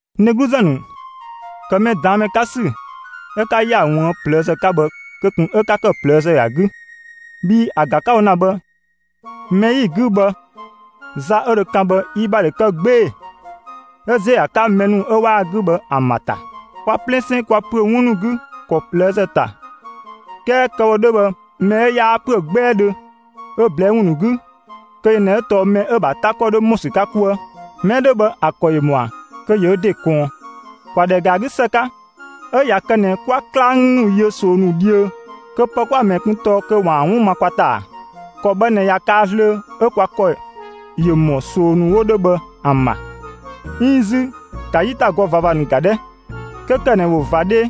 N dhegluzë ‑nu, ‑kë mɛ ꞊daan' ‑mɛ 'ka ‑sü 'ö 'ka ‑yaa ꞊wuën' ꞊plëëzë 'ka bhë, kö ꞊kun 'ö 'ka ‑kë ꞊plëëzë ‑a 'gü, bhii ‑a ‑ga 'ka‑ wo ‑na bhë mɛ 'yi‑ 'gü bhë, za 'ö dho kan bhë, yi ‑bha ‑dho kë 'gbee‑ 'ö ‑ziö ‑a 'ka mɛ ‑nu 'ö 'waa‑ 'gü bhë ‑an ‑bha ‑ta. Kwa 'plɛsɛn, kwa ‑püö 'wun ‑nu 'gü ‑kɔ ꞊plëëzë ‑ta 'kɛɛ kë‑ wo 'dhö bhë mɛ 'ö 'yaa ‑püö 'gbɛɛdhö ö ꞊blɛɛ' ‑wun ‑nu 'gü, kö yö ꞊nɛ 'ö tɔɔ mɛ 'ö‑ ‑bha 'ta ‑kɔ 'dho ‑mɔ ‑sü 'ka 'kuë. Mɛ 'ö 'dhö bhë ‑a ‑kɔ ‑yö ‑mɔa kö ‑yö ö ‑de ꞊kɔɔn. ‑Kwa ‑dhɛ ‑ga ‑a 'gü ‑së 'ka; 'ö ꞊ya kë ꞊nɛ 'kwa 'klang ‑nu yö ꞊soo ‑nu dhiö kö pë 'kwa‑ ꞊mɛɛ kun tɔɔ kö ‑waan 'wun ma kwa ‑ta ‑a? ‑Kɔ bhë ꞊nɛ ꞊ya kaa zlöö, 'ö kwa ‑kɔ ‑ya ‑mɔ ꞊soo ‑nu 'wo 'dhö bhë ‑an ‑bha. 'Iin 'zü ‑ka 'yitagɔ ꞊vava ‑nu ‑ga 'dhɛ! 'Kö ‑kë ꞊nɛ ‑wo ꞊va 'dhee,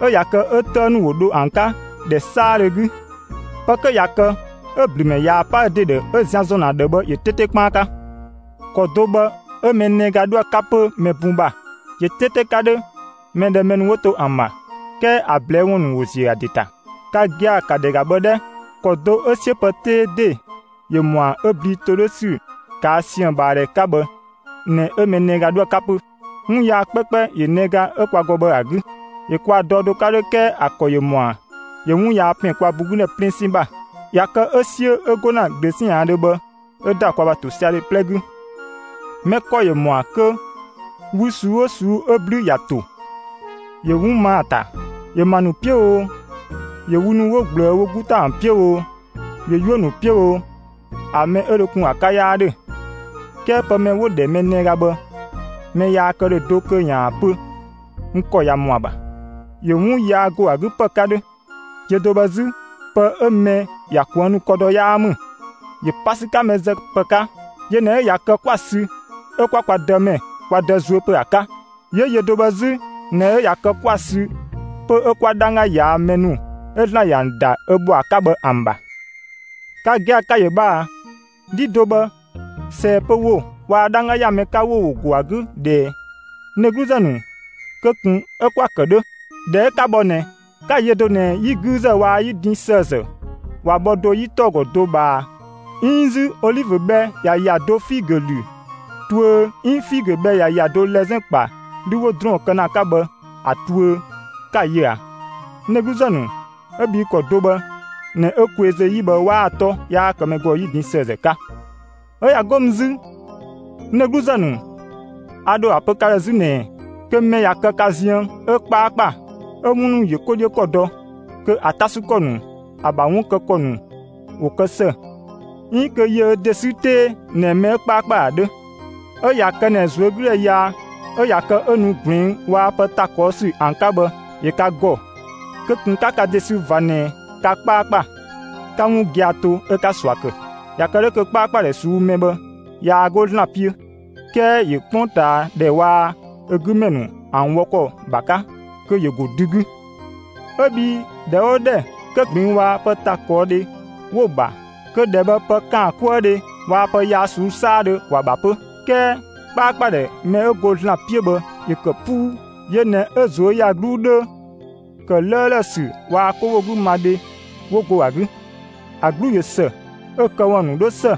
'ö ꞊ya kë 'ö 'tëë ‑nu ‑wo dho ‑an 'ka ‑dhɛ 'saadhö 'gü, pë 'kö ꞊ya kë 'ö‑ ‑blümɛ ꞊yaa‑ 'pa ö ‑de ‑dhë, 'ö zian ‑zɔn ‑a ‑dhë bhë ‑yö 'teete 'kpaan 'ka. ‑Kɔ do bhë 'ö mɛ nɛga 'dhoë‑ 'ka 'pö mɛ bun ‑bha. ‑Yö 'teete 'ka 'dhö mɛ ‑dhɛ mɛ ‑nu 'wo to ‑an ‑bha, 'kɛɛ ‑a ꞊blɛɛ' ‑wun ‑nu ‑wo ‑ziö ‑a ‑de ‑ta. Ka gia‑, ‑ka ‑dhɛ ‑ga bhë 'dhɛ; ‑kɔ do 'ö 'siö pë 'tee ‑de ‑yö ꞊mɔa' 'ö blii ‑to 'dhö ‑sü ꞊kaa' siën‑ ꞊bhaa ‑dhɛ 'ka bhë ꞊nɛ 'Ö nɛga 'dhoë‑ 'ka 'pö. 'Wun yaa 'kpɛkpɛ ‑yö nɛga 'ö kwa ‑gɔ bhë ‑a 'gü. ‑Yö kwa dɔ do 'ka 'dhö 'kɛɛ ‑a ‑kɔ ‑yö ‑mɔa ‑yö 'wun yaa ‑pɛn kwa bun 'gü ‑dhɛ 'plɛsɛn ‑bha. ꞊Ya kë 'ö 'siö 'ö 'go ‑na ꞊glöötiaandhö bhë 'ö‑ ‑da kwa ‑bha ‑tosiadhe 'plɛ 'gü. Mɛ ‑kɔ ‑yö ‑mɔa kö wü ꞊suu'‑ 'oo ꞊suu'‑ 'ö 'blü ‑ya ‑to, ‑yö 'wun ma ‑a ‑ta; ‑yö ‑ma ‑nu 'piö oo, ‑yö 'wun ‑nu 'wo ꞊gblëë wo 'gu ‑ta ‑an 'piö oo, ‑yö 'yuö‑ ‑nu 'piö oo, ‑a mɛ 'ö dho kun ‑a 'ka 'yaa 'dhö. 'Kɛɛ pë mɛ 'ö 'wo‑ ‑dhɛ mɛ nɛga bhë, mɛ yaa kë ‑dhö do ꞊kun kö ‑yaan ‑a pö: «N ‑kɔ ꞊ya ‑mɔ ‑a ‑bha». ‑Yö 'wun yaa ‑go ‑a 'gü ‑pë 'ka 'dhö; yö do bhë 'zü, pë 'ö mɛ ‑ya kuënnu ‑kɔ dɔ 'yaa ‑mü, ‑yö pa ‑sü 'ka mɛ zë ‑pë 'ka. Yö ꞊nɛ ꞊ya kë 'kwa‑ sü 'ö 'kwa kwa Dëmɛ, kwa Dë zuö pö ‑a 'ka; 'yö yö do bhë 'zü ꞊nɛ 'ö ꞊ya kë 'kwa‑ sü 'pö 'ö 'kwa 'dhangga ꞊yaa' mɛ ‑nu 'ö ‑Zlan ‑yö ‑an ‑da ö ‑bhɔa 'ka bhë ‑an ‑bha. Ka gia‑ ka‑ ‑yö bhë ꞊a! 'Dhi do bhë, ꞊sɛɛ‑ pö ‑wo waa‑ 'dhangga ‑ya mɛ 'ka ‑wo ‑wo go ‑a 'gü ꞊dhɛɛ? N dhegluzë ‑nu, kö ꞊kun 'ö 'kwa‑ ‑kë 'dhö. (꞊Dhɛ 'ö 'ka bhɔ ꞊nɛ,) 'ka‑ yö do ꞊nɛ 'yi 'güüzë waa‑ 'yi din ‑sëëzë ꞊wa bhɔ do 'yi 'tɔɔ‑ ‑gɔ do ꞊bhaa ꞊a? 'Iin 'zü olivö bhɛ ꞊ya ‑ya do figö ‑lü tuö 'iin figö bhɛ ꞊ya ‑ya do lɛzɛn ‑kpa 'lü 'wo ‑drɔɔn kë ‑na ‑a 'ka bhë ‑a ‑lü tuö, 'ka‑ yö a? N dhegluzë ‑nu, 'ö bhii ‑kɔ do bhë ꞊nɛ 'ö kweezö ‑yi bhë ꞊waa‑ 'tɔ 'yaa kë mɛ ‑gɔ 'yi din ‑sëëzë 'ka. ('Ö ꞊ya 'go mü 'zü, n dhegluzë ‑nu, a ‑dho ‑a pö ka ‑dhë 'zü ꞊nɛɛ:) Kö mɛ ꞊ya kë ka ziën 'ö 'kpaakpa, 'ö 'wun ‑nu ‑yö 'ko 'dhiö ‑kɔ dɔ, kö ‑a 'ta ‑sü ‑kɔ ‑nu, ‑a ‑bha 'wun kë ‑kɔ ‑nu ‑wo kë ‑së; 'iin kö ‑yö ö ‑de sü 'tee ꞊nɛ mɛ 'ö 'kpaakpa ‑a 'dhö. 'Ö ꞊ya kë ꞊nɛ ꞊zuögüdhɛ yaa 'ö ꞊ya kë 'ö nu ꞊gluɛng' waa‑ pë ‑ta ꞊kɔɔ' ‑sü ‑an 'ka bhë ‑yö ka ‑gɔ, kö ꞊kun 'ka ka ‑de sü ꞊va ꞊nɛ ka 'kpaakpa, 'ka 'wun gia‑ to, 'ö 'ka ꞊sua ‑kë. ꞊Ya kë 'dhö kö 'kpaakpadhɛ ꞊suu'‑ mɛ bhë, yaa 'go ‑Zlan 'piö, 'kɛɛ ‑yö 'kpongtaadhɛ waa‑ ö 'gü ‑mɛ ‑nu ‑an wɔ ‑kɔ ‑bha 'ka, kö ‑yö ‑go dü 'gü. 'Ö bhii ‑dhɛ 'oo ‑dhɛ kö ꞊gluɛng' waa‑ pë ‑ta ꞊kɔɔ' dhe 'wo‑ ‑bha, kö ‑dhɛ bhë pë ‑kaankuëdhe waa‑ pë yaa ꞊suu'‑ 'saadhö ‑wa ‑bha 'pö. 'Kɛɛ 'kpaakpadhɛ mɛ 'ö go ‑Zlan 'piö bhë ‑yö ‑kë 'puu; ‑yö ꞊nɛ 'ö ꞊zuöyagluu 'dhö, ‑kë 'lëëlë ‑sü waa‑ 'kowogümadhe 'wo go ‑a 'gü. ‑A 'glu ꞊yö ‑së, 'ö‑ këwun ‑nu 'dhö ‑së;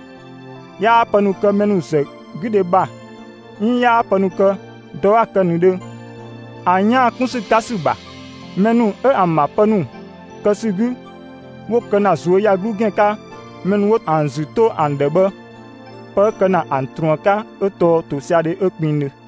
'yaa pë ‑nu kë mɛ ‑nu ‑zë 'gü dhe ‑bha 'iin 'yaa pë ‑nu kë dɔ 'a‑ kë ꞊nëdhö ‑an 'yaan‑ kun ‑sü 'ka ‑sü ‑bha. Mɛ ‑nu 'ö ‑an ‑bha pë ‑nu kë ‑sü 'gü, 'wo kë ‑na ꞊zuöyagluu ‑gɛn 'ka mɛ ‑nu 'wo ‑an ‑zü 'to ‑an ‑dhë bhë, pë 'ö kë ‑na ‑an ꞊truën 'ka 'ö tɔɔ ‑tosiadhe 'ö kpengdhö.